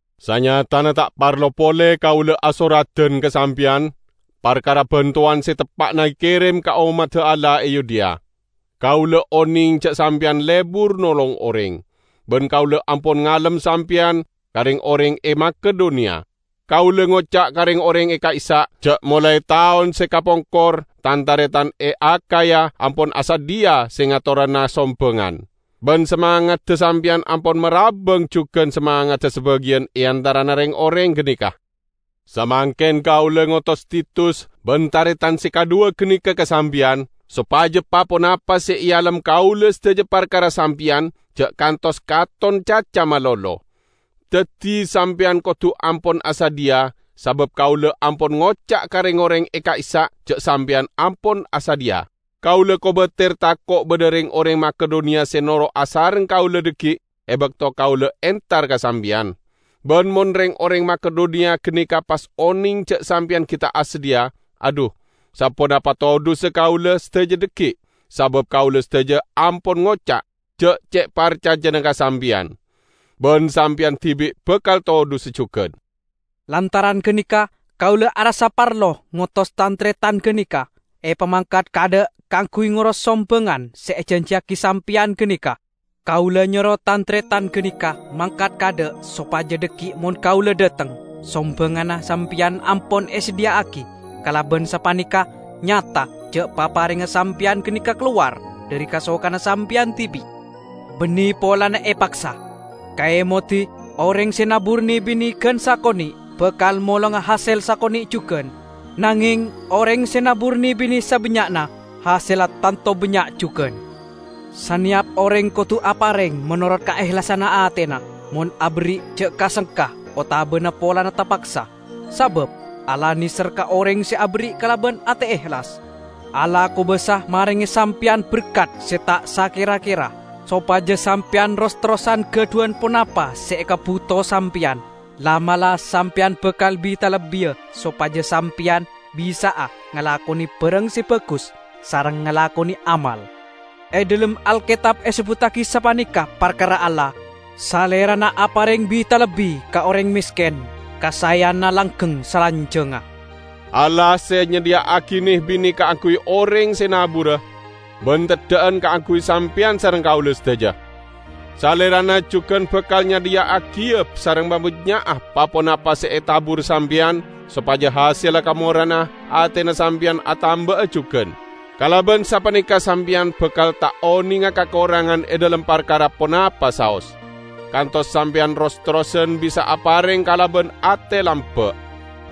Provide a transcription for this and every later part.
Sanyatana ta' parlo pole kaula asoradan ka sampeyan parkara bantowan se teppa'na ekerem ka ommadda Allah e Yudea. Kaula oneng ja' sampeyan lebur nolong oreng, ban kaula ampon ngalem sampeyan ka reng-oreng e Makedoniya. Kaula ngoca' ka reng-oreng e ka'issa', ja' molae taon se kapongkor tan-taretan e Akhaya ampon asadhiya se ngatorana sombangan. Ban samangadda sampeyan ampon marabbang jugan samangadda sabagiyan e antarana reng-oreng ganeka. Samangken kaula ngotos Titus ban taretan se kadhuwa ganeka ka sampeyan, sopaja pa-ponapa se ealem kaula sadaja parkara sampeyan ja' kantos katon caca malolo. Daddi, sampeyan kodu ampon asadhiya, sabab kaula ampon ngoca' ka reng-oreng e ka'issa' ja' sampeyan ampon asadhiya. Kaula kobater tako' badha reng-oreng Makedoniya se noro' asareng kaula dhaggi' e bakto kaula entar ka sampeyan. Ban mon reng-oreng Makedoniya ganeka pas oneng ja' sampeyan gi' ta' asadhiya, adhu, saponapa todhussa kaula sadaja dhaggi', sabab kaula sadaja ampon ngoca' ja' ce' parcajana ka sampeyan! Ban sampeyan dibi' bakal todhusa jugan. Lantaran ganeka kaula arassa parlo ngotos tan-taretan ganeka, epamangkat kaadha' kaangguy ngoros sombangan se ejanjiyagi sampeyan ganeka. Kaula nyoro tan-taretan ganeka mangkat kaadha' sopaja dhaggi' mon kaula dhateng, sombanganna sampeyan ampon esadhiya'agi. Kalaban sapaneka nyata ja' paparengnga sampeyan ganeka kalowar dhari kasokanna sampeyan dibi', banne polana epaksa. Kaemodi! Oreng se nabur ne-bine gan sakone' bakal molonga hasel sakone' jugan. Nangeng oreng se nabur ne-bine sabannya'na, hasella tanto bannya' jugan. Saneyap oreng kodu apareng menorot kaehlasanna atena. Mon aberri' ja' ka-sengka otabana polana tapaksa, sabab Allah neser ka oreng se aberri' kalaban ate ehlas. Allah kobasa marenge sampeyan berkat se ta' sakera-kera, sopaja sampeyan ros-terrosan gadhuwan ponapa se ekabuto sampeyan; la'-mala' sampeyan bakal bi-talebbiya sopaja sampeyan bisa'a ngalakone barang se bagus sareng ngalakone amal. E dhalem Alketab esebbuttagi sapaneka parkara Allah, "Salerana apareng bi-talebbi ka oreng mesken, kasaeyanna langgeng salanjangnga." Allah se nyadhiya'agi ne-bine kaangguy oreng se nabura, ban teddha'an kaangguy sampeyan sareng kaula sadaja. Salerana jugan bakal nyadhiya'agiya sareng mabannya'a pa-ponapa se etabur sampeyan, sopaja hasella kamora'anna atena sampeyan atamba'a jugan. Kalaban sapaneka sampeyan bakal ta' onenga kakorangan e dhalem parkara ponapa saos, kantos sampeyan ros-terrosan bisa apareng kalaban ate lamba'.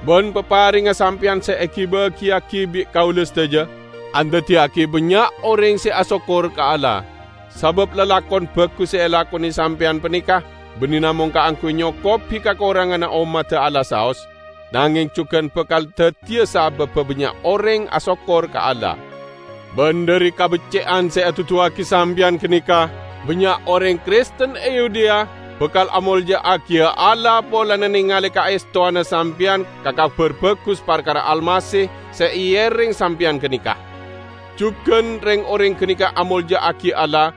Ban paparengnga sampeyan se egi-bagiyagi bi' kaula sadaja, andaddiyagi bannya' oreng se asokkor ka Allah. Sabab lalakon bagus se elakone sampeyan paneka banne namong kaangguy nyokobi kakoranganna ommadda Allah saos, nangeng jugan bakal daddiya sababba bannya' oreng asokkor ka Allah. Ban dhari kabecce'an se eduduwagi sampeyan ganeka, bannya' oreng Kristen e Yudea bakal amolja'agiya Allah polana nengale kaestowanna sampeyan ka Kabar Bagus parkara Almasih se eereng sampeyan ganeka. Jugan, reng-oreng ganeka amolja'agi Allah,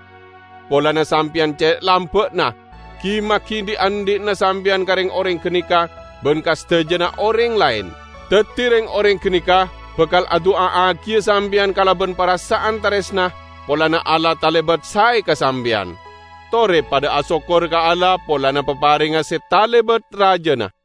polana sampeyan ce' lamba'na, gi-magi dhi'-andhi'na sampeyan ka reng-oreng ganeka ban ka sadajana oreng laen. Daddi reng-oreng ganeka bakal adu'a'agiya sampeyan kalaban parasa'an taresna polana Allah talebat sae ka sampeyan. Tore padha asokkor ka Allah polana paparengnga se talebat rajana!